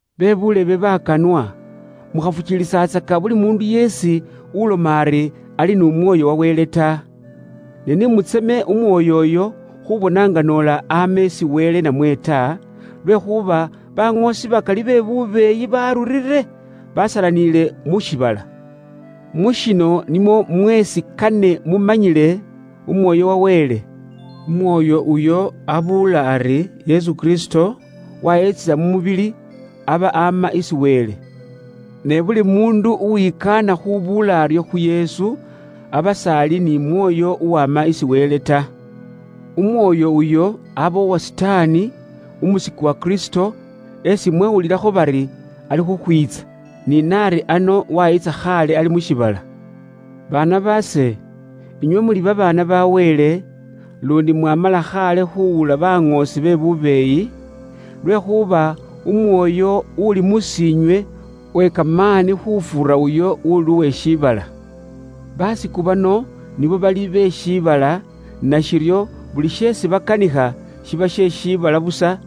Be buulebe bakanwa, mukhafukiilisatsaka buli muundu yeesi uloma ari, ali n'Umwoyo wa Wele ta. Ne ni mutseme Umwoyo uyo khubona nga noola ama isi Wele namwe ta, lwekhuuba baŋoosi be bubeeyi bakali benyukhile aasi, basalaniile mu shiibala. Mu shino nimwo mweesi kane mumanyile Umwoyo wa Wele: Umwoyo uyo ubuula ari Yesu Kristo wayiitsila mu mubili, aba ama isi Wele. Ne buli muundu uwikaana khubuula aryo khu Yesu, aba s'ali ni Mwoyo uwama isi Wele ta. Umwoyo uyo aba uwa Sitaani, umusiku wa Kristo esi mwawulilakho bari, alikhukhwiitsa, ni na ari ano wayiitsa khaale ali mu shiibala. Baana baase, inywe muli babaana ba Wele, luundi mwamala khaale khuuwula baŋoosi be bubeeyi, lwekhuuba Umwoyo uli mus'iinywe uwe kamaani khufuura uyo uuli uwe shiibala. Basiku bano nibo bali be shiibala, nashiryo buli sheesi bakanikha shiba she shiibala busa,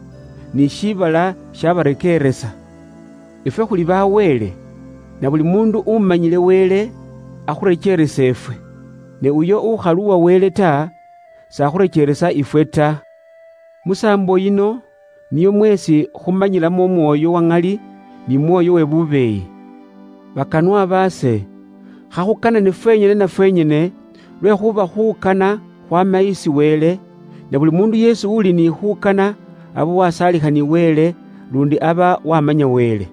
ni shiibala shibarekeeresa. Ifwe khuli ba Wele. Nabuli muundu umanyile Wele akhurekeeresa ifwe. Ne uyo ukhali uwa Wele ta, s'akhurekeeresa ifwe ta. Musaambo yino niyo mweesi khumanyilamo Umwoyo wa ŋali ni mwoyo we bubeeyi. Bakanwa baase, khakhukanane fwenyene na fwenyene, lwekhuuba khuukana khwaama isi Wele, na buli muundu uli ni khuukana aba wasaalikha ni Wele luundi aba waamanya Wele.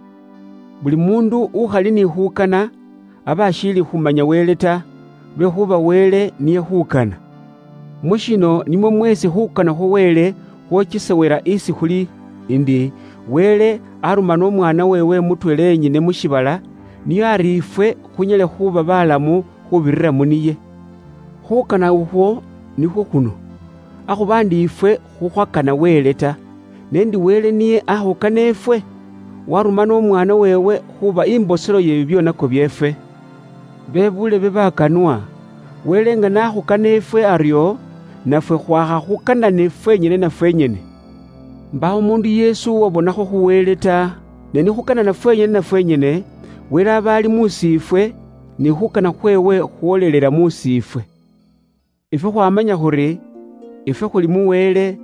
Buli muundu ukhali ni khuukana, aba ashiili khumanya Wele ta, lwekhuuba Wele niye khuukana. Mu shino nimwo mweesi khuukana khwa Wele khwokesewela isi khuli ndi: Wele aarumana umwaana weewe mutweela yenyene mu shiibala ari nio ifwe khunyale khuuba baalamu khuubirira mu niye. Khuukana ukhwo nikhwo khuno: akhuba ndi ifwe khukhwakana Wele ta, ne ndi Wele niye aakhukana ifwe, waarumana Umwaana weewe khuuba imboselo ye bibyoonako byeefwe. Bebuulebe bakanwa, Wele nga n'akhukana ifwe aryo, nafwe khwaakha khukanane fwenyene na fwenyene. Mbaawo umuundu yeesi uwabonakho khu Wele ta. Ne ni khuukanana fwenyene na fwenyene, Wele aba ali mus'iifwe, ni khuukana khweewe khwoolelela mus'iifwe. Ifwe khwaamanya khuri, ifwe khuli mu Wele,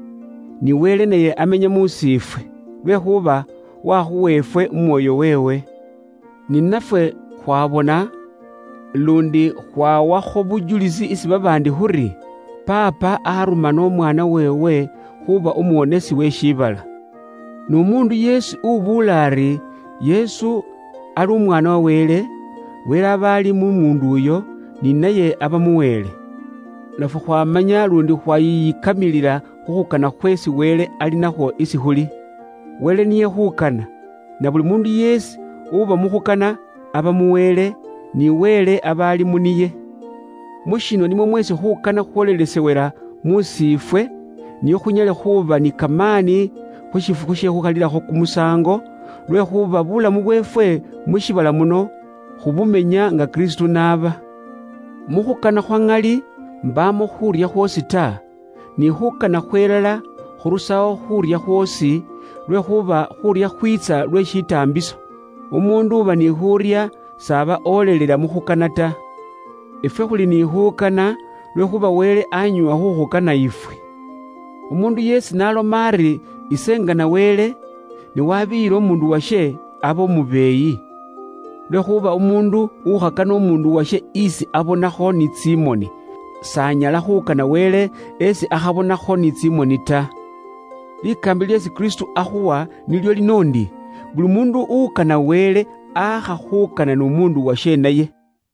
ni Wele naye amenya mus'iifwe, lwekhuuba wakhuwa ifwe Umwoyo weewe. Ni nafwe khwabona, luundi khwawakho bujulisi isi babaandi khuri, Paapa arumana Umwaana weewe khuuba Umuwonesi we shiibala. N'umuundu yeesi ubuula ari Yesu ali Umwaana wa Wele, Wele aba ali mu muundu uyo, ni naye aba mu Wele. Nafwe khwaamanya luundi khwaayiyikamilila khu khukana khweesi Wele ali nakhwo isi khuli. Wele niye khuukana, na buli muundu yeesi uba mu khukana, aba mu Wele, ni Wele aba ali mu niye. Mu shino nimwo mweesi khuukana khwoolelesewela mus'iifwe, nio khunyale khuuba ni kamaani khu shifukhu she khukhalilakho kumusaango, lwekhuuba buulamu bweefwe mu shiibala muno khubumenya nga Kristo n'aba. Mu khukana khwa ŋali mbaamo khuurya khwoosi ta, ni khuukana khwelala khurusawo khuurya khwoosi, lwekhuuba khuurya khwiitsa lwe shitaambiso. Umuundu uba ni khuurya s'aba olelela mu khukana ta. Ifwe khuli ni khuukana lwekhuuba Wele aanyoowa khuukhukana ifwe. Umuundu yeesi n'aloma ari, “Ise ngana Wele,” ne wabiiyila umuundu washe, aba umubeeyi. Lwekhuuba umuundu ukhakana umuundu washe isi abonakho ni tsimoni, s'anyala khuukana Wele isi akhabonakho ni tsimoni ta. Likaambila lyeesi Kristo akhuwa nilyo lino ndi: “Buli muundu ukana Wele, aakha khuukana n'umuundu washe naye.”